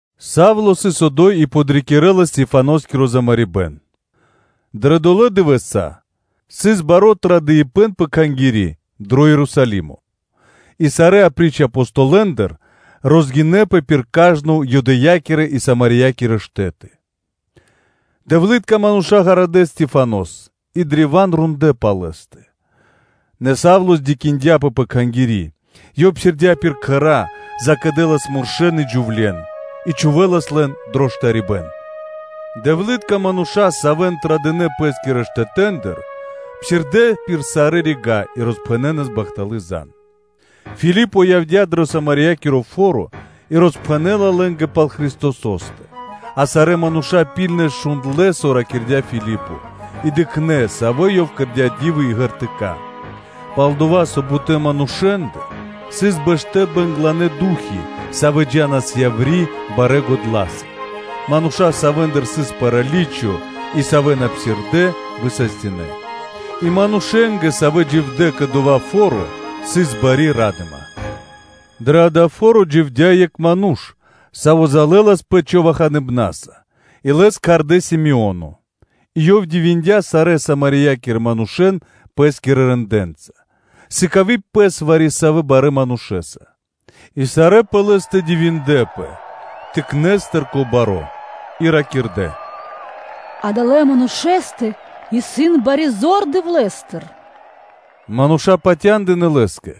Савло сыс одо́й и подрикирэлас Стехваноскиро замарибэн. Дро долэ́ дывэса́ сыс баро́ традыпэн пэ Кхангири́ дро Ерусалимо, и сарэ́, апри́ч Апостолэндэ, розгинэпэ пир кажно Юдэя́кирэ и Самариякирэ штэ́ты. Дэвлытка мануша́ гарадэ́ Стехванос и древа́н рондлэ́ пал лэ́стэ. Нэ Савло кэрдя́ бипатыв пэ кхангири́, ёв псирдя́ пир кхэра́, закэдэлас муршэ́н и джувле́н, и чхувэлас лэн дро штарибэ́н. Дэвлытка мануша́, савэ́н традынэ пэ́скирэ штэтэ́ндыр, псирдэ́ пир сарэ́ рига́ и роспхэнэнас бахталы́ зан (звесь). Филипо явдя́ дро Самариякиро фо́ро, и роспхэнэ́ла лэ́нгэ пал Христосо́стэ; а сарэ́ мануша́ ракхунэс шундлэ́, со ракирдя́ Филипо, и дыкхнэ́, савэ́ ёв кэрдя́ ди́вы и знаме́нии (ґертыка́). Пал-дова́ со бутэ́ манушэ́ндэ сыс бэштэ́ бэнгланэ ду́хи, савэ́ джа́нас яври́ барэ́ годла́са; мануша́, савэ́ндыр сыс праличо и савэ́ на псирдэ́, высастинэ. И манушэ́нгэ, савэ́ дживдэ́ кэ дова́ фо́ро, сыс бари ра́дыма. Дрэ дава́ фо́ро дживдя́ екх ману́ш, саво́ залэласпэ човаханыбнаса, и лэс кхардэ́ Си́моно и ёв дивиндя сарэ́ Самариякирэ манушэ́н пэ́скирэ рэндэ́нца, сыкави пэс вари-савэ́ барэ́ манушэ́са. И сарэ́ пэ лэ́стэ дивиндлэ́пэ, тыкнэстыр кэ баро́ и ракирдэ́: “Адалэ́ манушэ́стэ исын бари зор Дэвлэ́стыр.” Мануша́ патяндынэ́ лэ́скэ,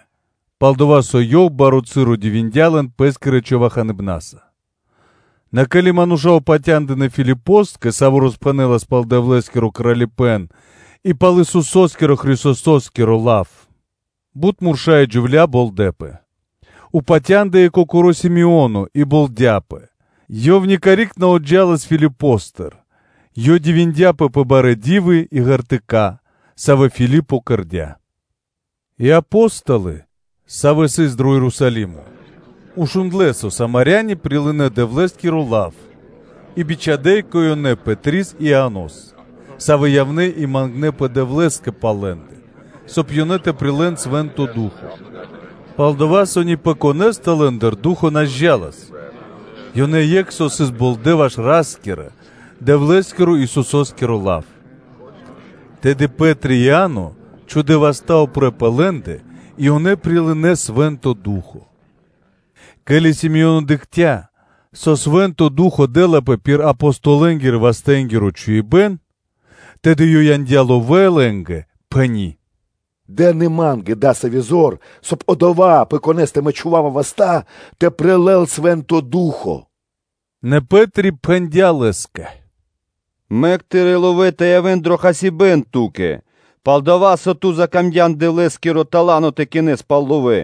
пал-дова́ со ёв баро́ часо дивиндя лэн пэ́скирэ човаханыбнаса. Нэ, ке́ли мануша́ упатя́ндынэ Филипоскэ, саво́ роспхэнэлас пал Дэвлэ́скиро Кралипэ́н и пал Исусо́скиро Христосо́скиро лав, бут мурша́ и джувля́ болдэпэ. Патяндыя и кокоро́ Си́моно и болдяпэ, ёв никарик на отджалас Филипостыр: ёв дивиндяпэ пэ барэ́ ди́вы и ґертыка́, савэ́ Филипо кэрдя́. И Апо́столы, савэ́ сыс дро Ерусалимо, шундлэ́, со Самаряни прилынэ́ Дэвлэ́скиро лав и бичхадя́ кэ ёнэ Пэтрис и Ианос, савэ́ явнэ́ и мангнэпэ Дэвлэ́скэ пал лэ́ндэ, соб (кай) ёнэ тэ прилэ́н Свэ́нто Ду́хо (Фа́но); пал-дова́ со ни пэ конэ́стэ лэ́ндыр Ду́хо (Фа́но) на зджалас, ёнэ екх со сыс болдэ ваш Ра́скирэ-Дэвлэ́скиро Исусо́скиро лав. Тэды Пэ́три и Иа́но чхудэ́ васта́ упрэ́ пэ лэ́ндэ, и ёнэ прилынэ́ Свэ́нто Ду́хо (Фа́но). Ке́ли Си́моно дыкхця́, со Свэ́нто Ду́хо (Фа́но) дэ́лапэ пир Апостолэнгирэ-вастэнгиро чхуибэ́н, тэды ёв яндя́ ловэ́ лэ́нгэ, пхэни́: “Дэн и ма́нгэ дасави́ зор, мангдя́ ёв, соб (кай) одова́, пэ конэ́стэ мэ чхува́ва васта́, тэ прилэл Свэ́нто Ду́хо (Фа́но).” Нэ Пэ́три пхэндя́ лэ́скэ: “Мэк тырэ́ ловэ́ тэ явэ́н дро хасибэ́н ту́кэ, пал-дова́ со ту закамдян Дэвлэ́скиро тала́но тэ кинэс пал ловэ́.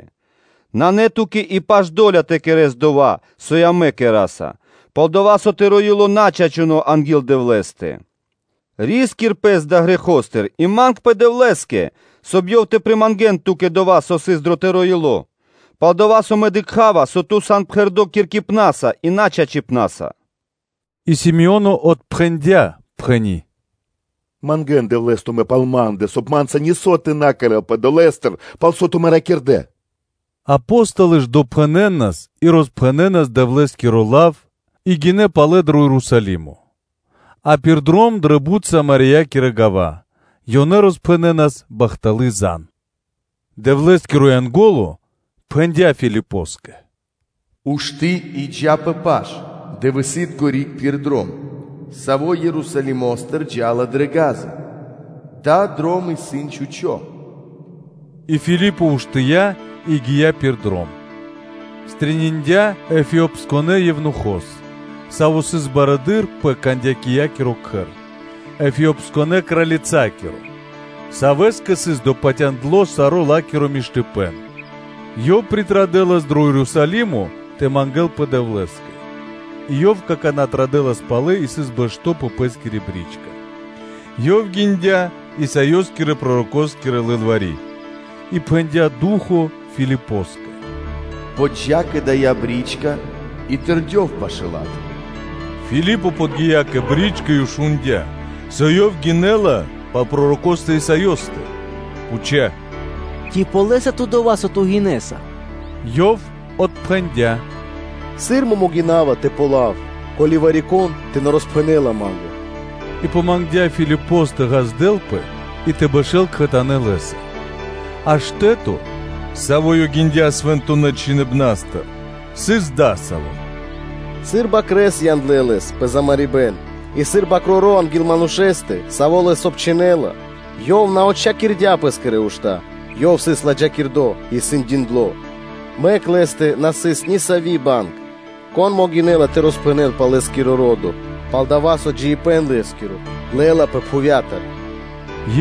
Нанэ ту́кэ паш и до́ля тэ кэрэ́с дова́, со амэ кэра́са, пал-дова́ со тыро́ ило́ исын на чачуно́ анги́л Дэвлэ́стэ. Ри́скир пэс далэ́ грэхостыр и мангпэ Дэвлэ́скэ; соб (кай) Ёв тэ примангэн ту́кэ дова́, со сыс дро тыро́ ило́; пал-дова́ со мэ дыкха́ва, со ту сан пхэрдо́ киркипнаса и начачипнаса.” И Си́моно отпхэндя́, пхэни́: “Мангэ́нпэ Дэвлэ́скэ тумэ́ пал ма́ндэ, соб (кай) ма́нца нисо́ тэ на кэрэ́лпэ долэ́стыр, пал со тумэ́ ракирдэ́.” Апо́столы ж допхэнэнас и роспхэнэнас Дэвлэ́скиро лав и гинэ́ палэ дро Ерусалимо, а пир дром дрэ бут Самариякирэ гава́ ёнэ роспхэнэнас бахталы́ зан (звесь). Дэвлэ́скиро Янго́ло пхэндя́ Филипоскэ: “Ушты́ и джа́ пэ паш-дывэсы́тко (южно) риг пир дром, саво́ Ерусалимо́стыр джа́ла дрэ Газа, дава́ дром исын чхучо́.” И Филипо уштыя́ и гия́ пир дром, стрэниндя (пирилыя) Эфиопиякирэ евнухос, саво́ сыс барыдыро́ пэ Кандакиякиро кхэр, Эфиопиякирэ кралицакиро, савэ́скэ сыс допатяндло саро́ ла́киро кучипэ́н; ёв явэлас дро Ерусалимо тэ мангэ́лпэ Дэвлэ́скэ, и ёв какана́ традэлас палэ и сыс бэшто́ пэ пэ́скири бричка: ёв гиндя Исаёскирэ-пророкоскири лылвари́. И пхэндя́ Ду́хо (Фа́но) Филипоскэ: “Джа пашы́л кэ дая́ бричка и тэрдёв пашы́л ла́тэ.” Филипо подги́я кэ бричка и шундя́, со ёв гинэ́ла пал пророкостэ Исаёстэ, пхуця́: “Ци ґалёса ту дова́, со ту гинэса?” Ёв отпхэндя́: “Сыр мэ могина́ва тэ ґалёвав, ко́ли вари-кон тэ на роспхэнэ́ла ма́нгэ?” И помангдя Филипос тэ ґаздэлпэ и тэ бэшэ́л кхэтанэ́ лэ́са. А штэ́то, саво́ ёв гиндя Свэнтонэ́ Чхиныбна́стыр, сыс дасаво: “Сыр бакрэ́с яндлэ́ Лэс пэ замарибэн, и сыр бакроро́ анги́л манушэ́стэ, саво́ лэс обчхинэла, Ёв на отчхакирдя́ Пэ́скирэ ушта́. Ёв сыс ладжакирдо́ и сэндиндло, мэк Лэ́стэ на сыс нисави́ банг, кон могинэ́ла тэ роспхэнэл пал Лэ́скиро ро́до? Пал-дова́ со джиибэ́н Лэ́скиро лэ́лапэ пхувья́тыр.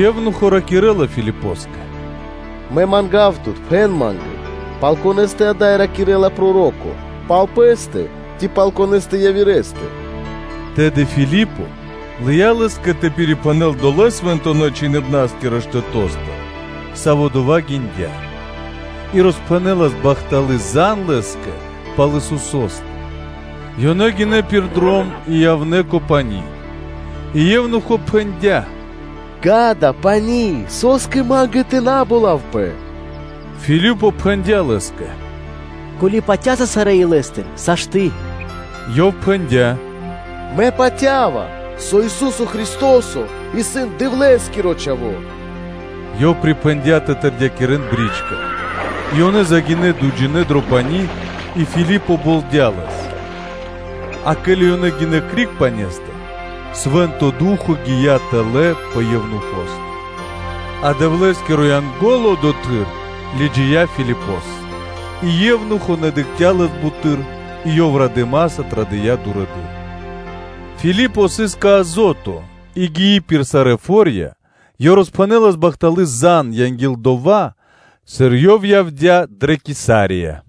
Евнухо ракирэ́ла Филипоскэ: “Мэ манга́ва тут, пхэн ма́нгэ: пал конэ́стэ ада́й ракирэ́ла проро́ко? Пал пэ́стэ, ци пал Конэ́стэ явирэ́стэ?” Тэды Филипо лыя́ лэ́скэ тэ пирипхэнэл долэ́ Свэнтонэ́-Чхиныбнаскирэ штэто́стыр, саво́ дова́ гиндя, и роспхэнэлас бахталы́ зан лэ́скэ пал Исусо́стэ. Ёнэ гинэ́ пир дром и явнэ́ кэ пани́ и евнухо пхэндя́: “Ѓа́да, исын пани́, со́скэ ма́нгэ тэ на болавпэ?” Филипо пхэндя́ лэ́скэ: “Ко́ли (со) ту патя́са сарэ́ илэ́стыр, сашты́.” Ёв пхэндя́: “Мэ патя́ва, со Ису́со Христо́со исын Дэвлэ́скиро Чхаво́.” Ёв припхэндя́ тэ тэрдякирэн бричка. И ёнэ загинэ́ дуйджинэ́ дро пани́ и Филипо болдя лэс. А ке́ли ёнэ гинэ́ криг пане́стыр, Свэ́нто Ду́хо (Фа́но) гия́ тэлэ́ пэ евнухостэ; а Дэвлэ́скиро Янго́ло одотхы́р лыджия́ Филипос, и евнухо на дыкхця́ лэс буты́р, и ёв радыма́са традыя́ дурэды́р. Филипо сыс кэ Азото и гии пир сарэ́ фо́рья, ёв роспхэнэлас бахталы́ зан, анги́л дова́, сыр ёв явдя́ дрэ Кесария.